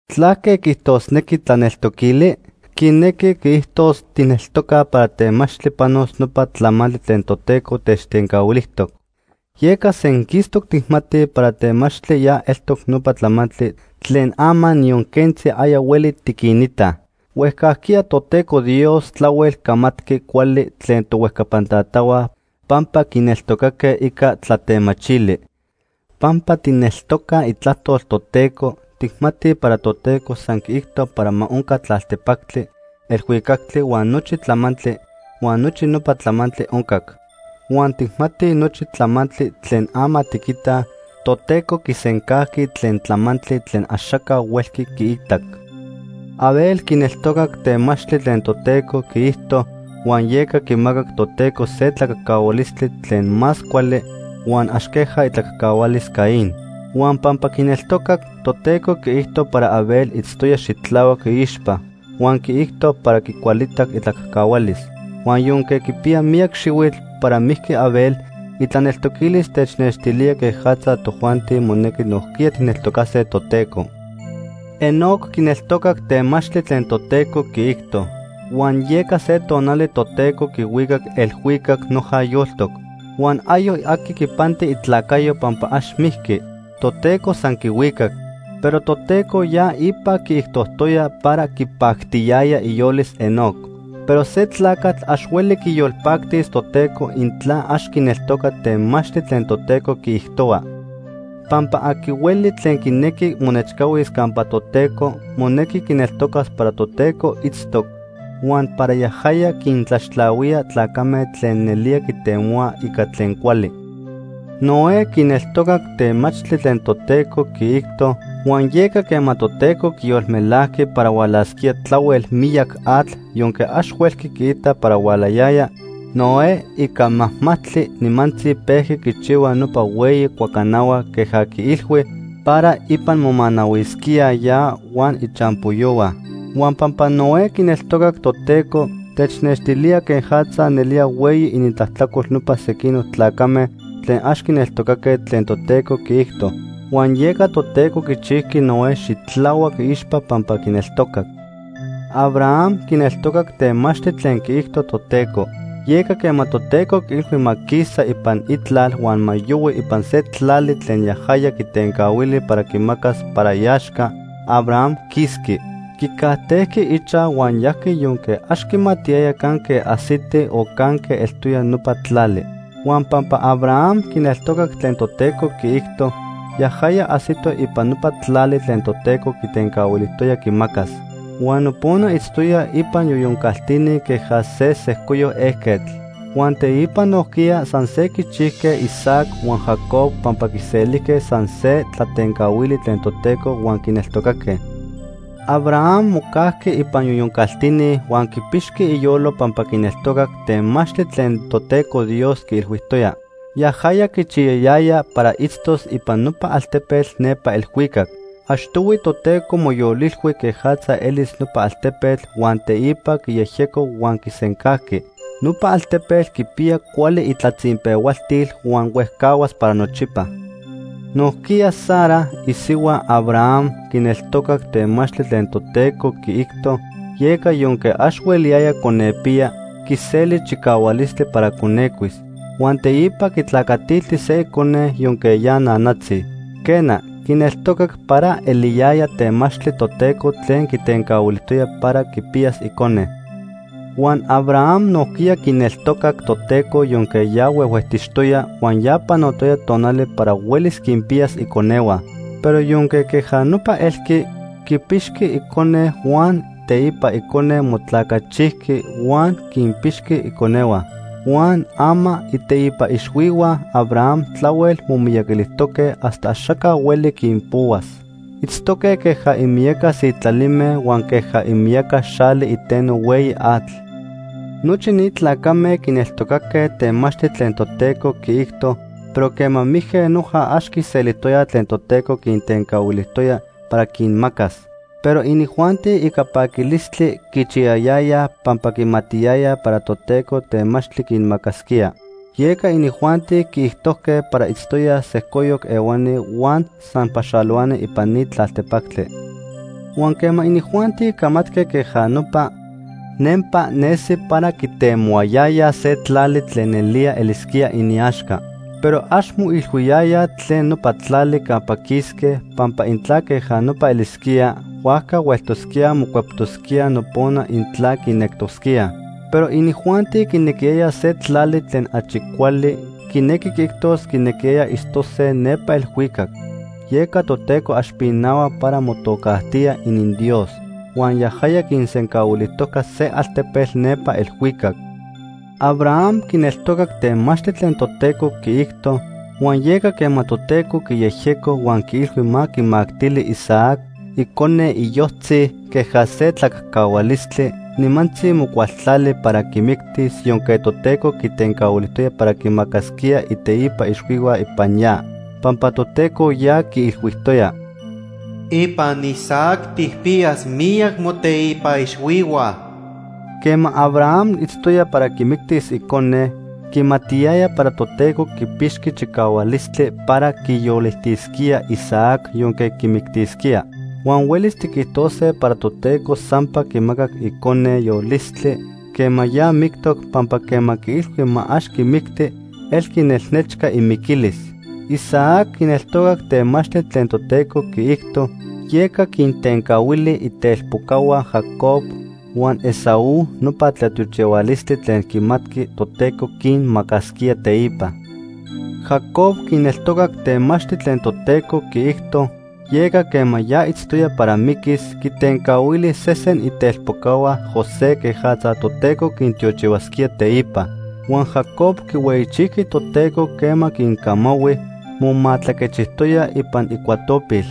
¿Tlaque quiijtosnequi tlaneltoquili? Quinequi quiijtos tijneltocaj para temachtli panos nopa tlamantli tlen Toteco techtencahuilijtoc. Yeca senquistoc tijmatij para temachtli ya eltoc nopa tlamantli tlen ama niyon quentzi aya hueli tiquinitaj. Huejcajquiya Toteco Dios tlahuel camatqui cuali tlen tohuejcapan tatahua pampa quineltocaque ica tlatemachili. Pampa tijneltocaj Itlajtol Toteco, tijmatij para Toteco san quiijto para ma onca tlaltepactli, elhuicactli huan nochi tlamantli, huan nochi nopa tlamantli oncac. Huan tijmatij nochi tlamantli tlen ama tiquitaj, Toteco quisencajqui tlen tlamantli tlen axaca huelqui quiitac. Abel quineltocac temachtli tlen Toteco quiijto huan yeca quimacac Toteco se tlacajcahualistli tlen más cuali huan ax queja itlacajcahualis Caín. Huan pampa quineltocac, Toteco quiijto para Abel itztoya xitlahuac iixpa, huan quiijto para quicualitac itlacajcahualis. Huan yonque quipiya miyac xihuitl para mijqui Abel, itlaneltoquilis technextilía quejatza tojuanti monequi nojquiya tijneltocase Toteco. Enoc quineltocac temachtli tlen Toteco quiijto, huan yeca se tonali Toteco quihuicac elhuicac noja yoltoc. Huan ayoc aqui quipanti itlacayo pampa ax mijqui; Toteco san quihuicac. Pero Toteco ya ipa quiijtojtoya para quipactiyaya iyolis Enoc. Pero se tlacatl ax hueli quiyolpactis Toteco intla ax quineltoca temachtli tlen Toteco quiijtohua. Pampa aqui hueli tlen quinequi monechcahuis campa Toteco, monequi quineltocas para Toteco itztoc, huan para yajaya quintlaxtlahuía tlacame tlen nelía quitemohuaj ica tlen cuali. Noé quineltocac temachtli tlen Toteco quiijto, huan yeca quema Toteco quiyolmelajqui para hualasquía tlahuel miyac atl yonque ax huelqui quiita para hualayaya, Noé, ica majmajtli, nimantzi pejqui quichijchihua nopa hueyi cuacanahua queja quiilhui, para ipan momanahuisquíaj ya huan ichampoyohua. Huan pampa Noé quineltocac Toteco, technextilía quejatza nelía hueyi inintlajtlacol nopa sequinoc tlacame tlen ax quineltocaque tlen Toteco quiijto. Huan yeca Toteco quichijqui Noé xitlahuac iixpa pampa quineltocac. Abraham quineltocac temachtli tlen quiijto Toteco. Yeca quema Toteco quiilhui ma quisa ipan itlal huan ma yohui ipan se tlali tlen yajaya quitencahuili para quimacas para iaxca, Abraham quisqui. Quicajtejqui ichaj huan yajqui yonque ax quimatiyaya canque ajsiti o canque eltoya nopa tlali. Huan pampa Abraham quineltocac tlen Toteco quiijto, yajaya ajsito ipan nopa tlali tlen Toteco quitencahuilijtoya quimacas. Huan nopona itztoya ipan yoyon caltini queja se sejcoyoc ejquetl. Huan teipa nojquiya san se quichijque Isaac huan Jacob pampa quiselijque san se tlatencahuali tlen Toteco huan quineltocaque. Abraham mocajqui ipan yoyon caltini huan quipixqui iyolo pampa quineltocac temachtli tlen Toteco Dios quiilhuijtoya. Yajaya quichiyayaya para itztos ipan nopa altepetl nepa elhuicac. Achtohui Toteco moyolilhui quejatza elis nopa altepetl huan teipa quiyejyeco huan quisencajqui. Nopa altepetl quipiya cuali itlatzinpehualtil huan huejcahuas para nochipa. Nojquiya Sara, isihua Abraham, quineltocac temachtli tlen Toteco quiijto, yeca yonque ax hueliyaya conepiya, quiseli chicahualistli para conecuis. Huan teipa quitlacatilti se icone yonque ya nanatzi. Quena, quineltocac para eliyaya temachtli Toteco tlen quitencahuilijtoya para quipiyas icone. Huan Abraham nojquiya quineltocac Toteco yonque ya huehuejtixtoya huan ya panotoya tonali para huelis quinpiyas iconehua. Pero yonque queja nopa elqui, quipixqui icone huan teipa icone motlacachijqui huan quinpixqui iconehua. Huan ama iteipa ixhuihua Abraham tlahuel momiyaquilijtoque hasta axaca hueli quinpohuas. Itztoque queja imiyaca sitlalime huan queja imiyaca xali iteno hueyi atl. Nochi ni tlacame quineltocaque temachtli tlen Toteco quiijto, pero quema mijque noja ax quiselijtoyaj tlen Toteco quintencahuilijtoya para quinmacas. Pero inijuanti ica paquilistli quichiyayayaj pampa quimatiyayaj para Toteco temachtli quinmacasquía. Yeca inijuanti quiijtojque para itztoyaj sejcoyoc ehuani huan san paxalohuani ipan ni tlaltepactli. Huan quema inijuanti camatque queja nopa, nempa nesi para quitemohuayayaj se tlali tlen nelía elisquía iniaxca. Pero ax moilhuiyayaj tlen nopa tlali campa quisque, pampa intla queja nopa elisquía, huajca hueltosquíaj mocueptosquíaj nopona intla quinectosquíaj. Pero inijuanti quinequiyayaj se tlali tlen achi cuali, quinequi quiijtos quinequiyayaj itztose nepa elhuicac. Yeca Toteco ax pinahua para motocajtía ininDios, huan yajaya quinsencahuilijtojca se altepetl nepa elhuicac. Abraham quineltocac temachtli tlen Toteco quiijto, huan yeca quema Toteco quiyejyeco huan quiilhui ma quimactili Isaac, icone iyojtzi, queja se tlacajcahualistli, nimantzi mocualtlali para quimictis yonque Toteco quitencahuilijtoya para quimacasquía iteipa ixhuihua ipan ya. Pampa Toteco ya quiilhuijtoya: “Ipan Isaac tijpiyas miyac moteipa ixhuihua.” Quema Abraham itztoya para quimictis icone, quimatiyaya para Toteco quipixqui chicahualistli para quiyolitisquía Isaac yonque quimictisquía. Huan huelis tiquijtose para Toteco sampa quimacac icone yolistli quema ya mictoc pampa quema quiilhui ma ax quimicti elqui nelnechca imiquilis. Isaac quineltocac temachtli tlen Toteco quiijto, yeca quintencahuili itelpocahua Jacob huan Esaú nopa tlatiochihualistli tlen quimatqui Toteco quinmacasquía teipa. Jacob quineltocac temachtli tlen Toteco quiijto, yeca quema ya itztoya para miquis, quitencahuili sesen itelpocahua José quejatza Toteco quintiochihuasquía teipa. Huan Jacob quihueyichijqui Toteco quema quincamahui, momatlaquechijtoya ipan icuatopil.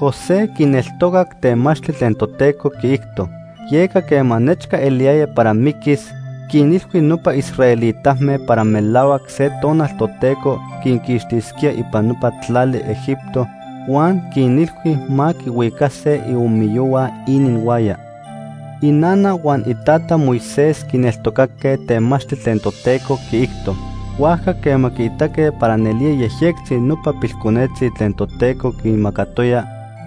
José quineltocac temachtli tlen Toteco quiijto. Yeca quema nechca eliyaya para miquis, quinilhui nopa israelitame para melahuac se tonal Toteco quinquixtisquía ipan nopa tlali Egipto huan quinilhui ma quihuicase iomiyohua ininhuaya. Inana huan itata Moisés quineltocaque temachtli tlen Toteco quiijto. Huajca quema quiitaque para nelía yejyectzi nopa pilconetzi tlen Toteco quinmacatoya,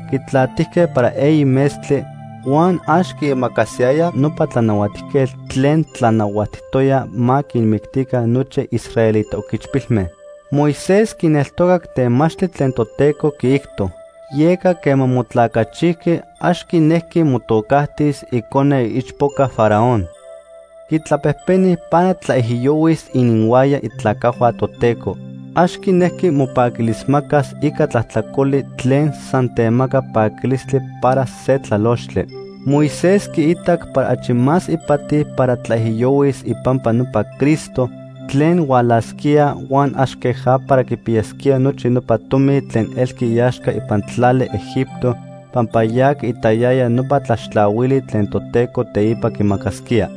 quitlatijque para eyi metztli, huan ax quiimacasiyayaj nopa tlanahuatijquetl tlen tlanahuatijtoya ma quinmictica nochi israelita oquichpilme. Moisés quineltocac temachtli tlen Toteco quiijto. Yeca quema motlacachijqui ax quinejqui motocajtis icone iichpoca Faraón. Quitlapejpeni para tlaijiyohuis ininhuaya itlacajhua Toteco. Ax quinejqui mopaquilismacas ica tlajtlacoli tlen san temaca paquilistli para se tlalochtli. Moisés quiitac para achi más ipati para tlaijiyohuis ipampa nopa Cristo tlen hualasquía huan ax queja para quipiyas nochi nopa tomi tlen elqui iaxca ipan tlali Egipto, pampa ya quiitayaya nopa tlaxtlahuili tlen Toteco teipa quimacasquía.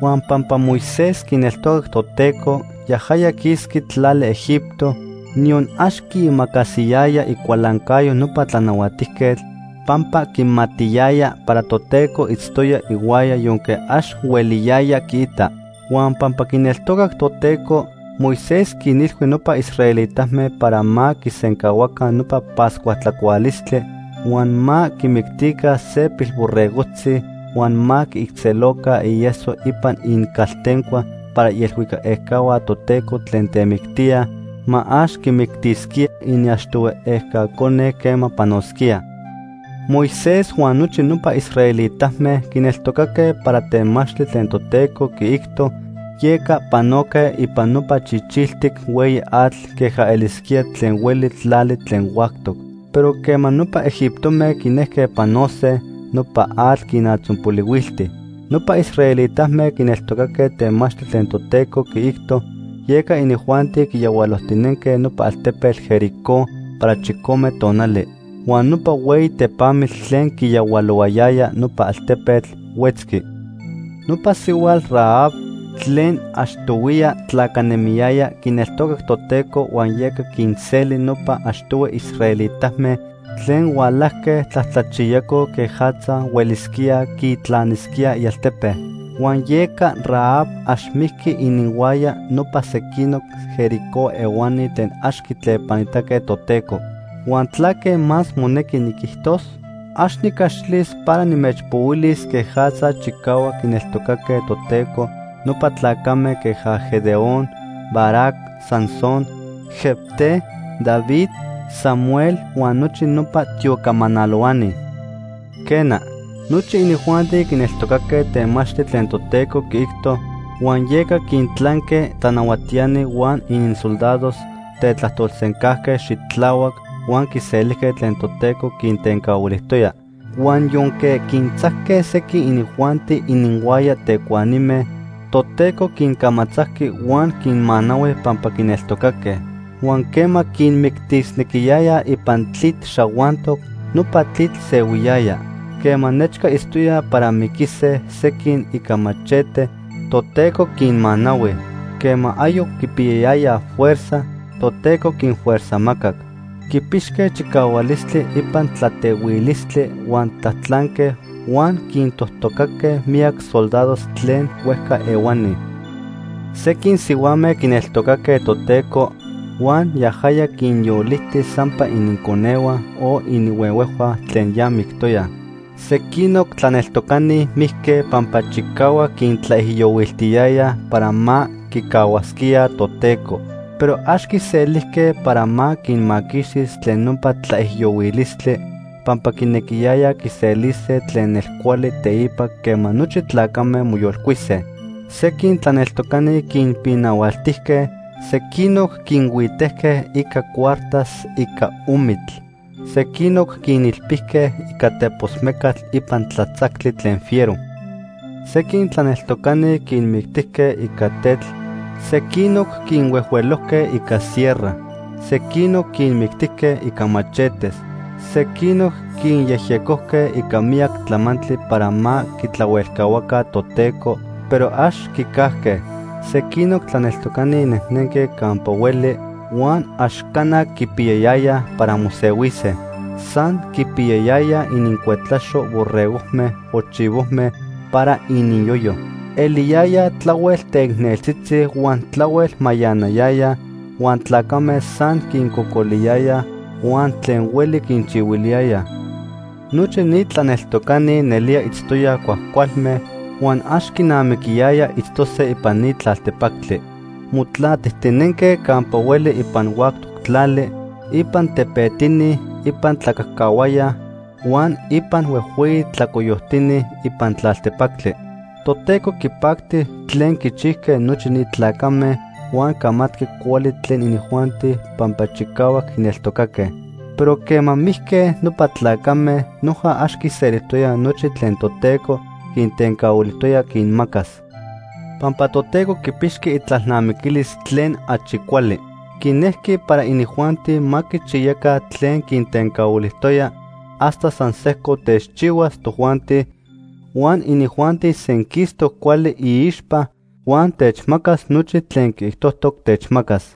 Huan pampa Moisés quineltocac Toteco, yajaya quisqui tlali Egipto, niyon ax quiimacasiyaya icualancayo nopa tlanahuatijquetl, pampa quimatiyaya para Toteco itztoya ihuaya yonque ax hueliyaya quiita. Huan pampa quineltocac Toteco, Moisés quinilhui nopa israelitame para ma quisencahuaca nopa Pascua tlacualistli, huan ma quimictica se pilborregojtzi huan ma quiijtzeloca ieso ipan inincaltencua para ielhuicac ejca Toteco tlen temictía, ma ax quimictisquía iniachtohui ejca cone quema panosquía. Moisés huan nochi nopa israelitame quineltocaque para temachtli tlen Toteco quiijto, yeca panoque ipan nopa Chichiltic Hueyi Atl queja elisquía tlen hueli tlali tlen huactoc. Pero quema nopa egiptome quinejque panose, nopa atl quinatzonpolihuilti. Nopa israelitame quineltocaque temachtli tlen Toteco quiijto, yeca inijuanti quiyahualojtinenque nopa altepetl Jericó para chicome tonali. Huan nopa hueyi tepamitl tlen quiyahualohuayaya nopa altepetl, huetzqui. Nopa sihuatl Rahab tlen achtohuiya tlacanemiyaya quineltocac Toteco huan yeca quinseli nopa achtohui israelitame tlen hualajque tlajtlachiyacoj quejatza huelisquíaj quitlanisquíaj ialtepe. Huan yeca Rahab ax mijqui ininhuaya nopa sequinoc Jericó ehuani tlen ax quitlepanitaque Toteco. ¿Huan tlaque más monequi niquijtos? Ax nicaxilis para nimechpohuilis quejatza chicahuac quineltocaque Toteco nopa tlacame queja Gedeón, Barac, Sansón, Jefté, David, Samuel huan nochi nopa tiocamanalohuani. Quena, nochi inijuanti quineltocaque temachtli tlen Toteco quiijto huan yeca quintlanque tlanahuatiani huan ininsoldados, tetlajtolsencajque xitlahuac huan quiselijque tlen Toteco quintencahuilijtoya. Huan yonque quintzajque sequin inijuanti ininhuaya tecuanime, Toteco quincamatzajqui huan quinmanahui pampa quineltocaque. Huan quema quinmictisnequiyayaj ipan tlitl xahuantoc, nopa tlitl sehuiyaya. Quema nechca itztoyaj para miquise sequin ica machete, Toteco quinmanahui. Quema ayoc quipiyayayaj fuerza, Toteco quinfuerzajmacac. Quipixque chicahualistli ipan tlatehuilistli huan tlatlanque, huan quintojtocaque miyac soldados tlen huejca ehuani. Sequin sihuame quineltocaque Toteco huan yajaya quinyoliti sampa ininconehua o ininhuehuejhua tlen ya mictoyaj. Sequinoc tlaneltocani mijque pampa chicahuac quintlaijiyohuiltiyayaj para ma quicahuasquíaj Toteco, pero ax quiselijque para ma quinmaquixtis tlen nopa tlaijiyohuilistli, pampa quinequiyayaj quiselise tlen nelcuali teipa quema nochi tlacame moyolcuise. Sequin tlaneltocani quinpinahualtijque, sequinoc quinhuitejque ica cuartas ica omitl, sequinoc quinilpijque ica tepos mecatl ipan tlatzactli tlen fiero. Sequin tlaneltocani quinmictijque ica tetl, sequinoc quinhuejhuelojque ica sierra, sequinoc quinmictijque ica machetes, sequinoc quinyejyecojque ica miyac tlamantli para ma quitlahuelcahuaca Toteco, pero ax quicajque. Sequinoc tlaneltocani nejnenque campa hueli huan ax cana quipiyayayaj para mosehuise. San quipiyayayaj inincuetlaxo borregojme o chivojme para ininyoyo. Eliyayaj tlahuel teicneltzitzi huan tlahuel mayanayayaj, huan tlacame san quincocoliyayaj huan tlen hueli quinchihuiliyayaj. Nochi ni tlaneltocani nelía itztoyaj cuajcualme huan ax quinamiquiyaya itztose ipan ni tlaltepactli. Motlatijtinenque campa hueli ipan huactoc tlali, ipan tepetini, ipan tlacajcahuaya huan ipan huejhueyi tlacoyoctini ipan tlaltepactli. Toteco quipacti tlen quichijque nochi ni tlacame huan camatqui cuali tlen inijuanti pampa chicahuac quineltocaque. Pero quema mijque nopa tlacame, noja ax quiselijtoyaj nochi tlen Toteco quintencahuilijtoya quinmacas. Pampa Toteco quipixqui itlalnamiquilis tlen achi cuali. Quinejqui para inijuanti ma quichiyaca tlen quintencahuilijtoya hasta san sejco techchihuas tojuanti huan inijuanti senquistoc cuali iixpa huan techmacas nochi tlen quiijtojtoc techmacas.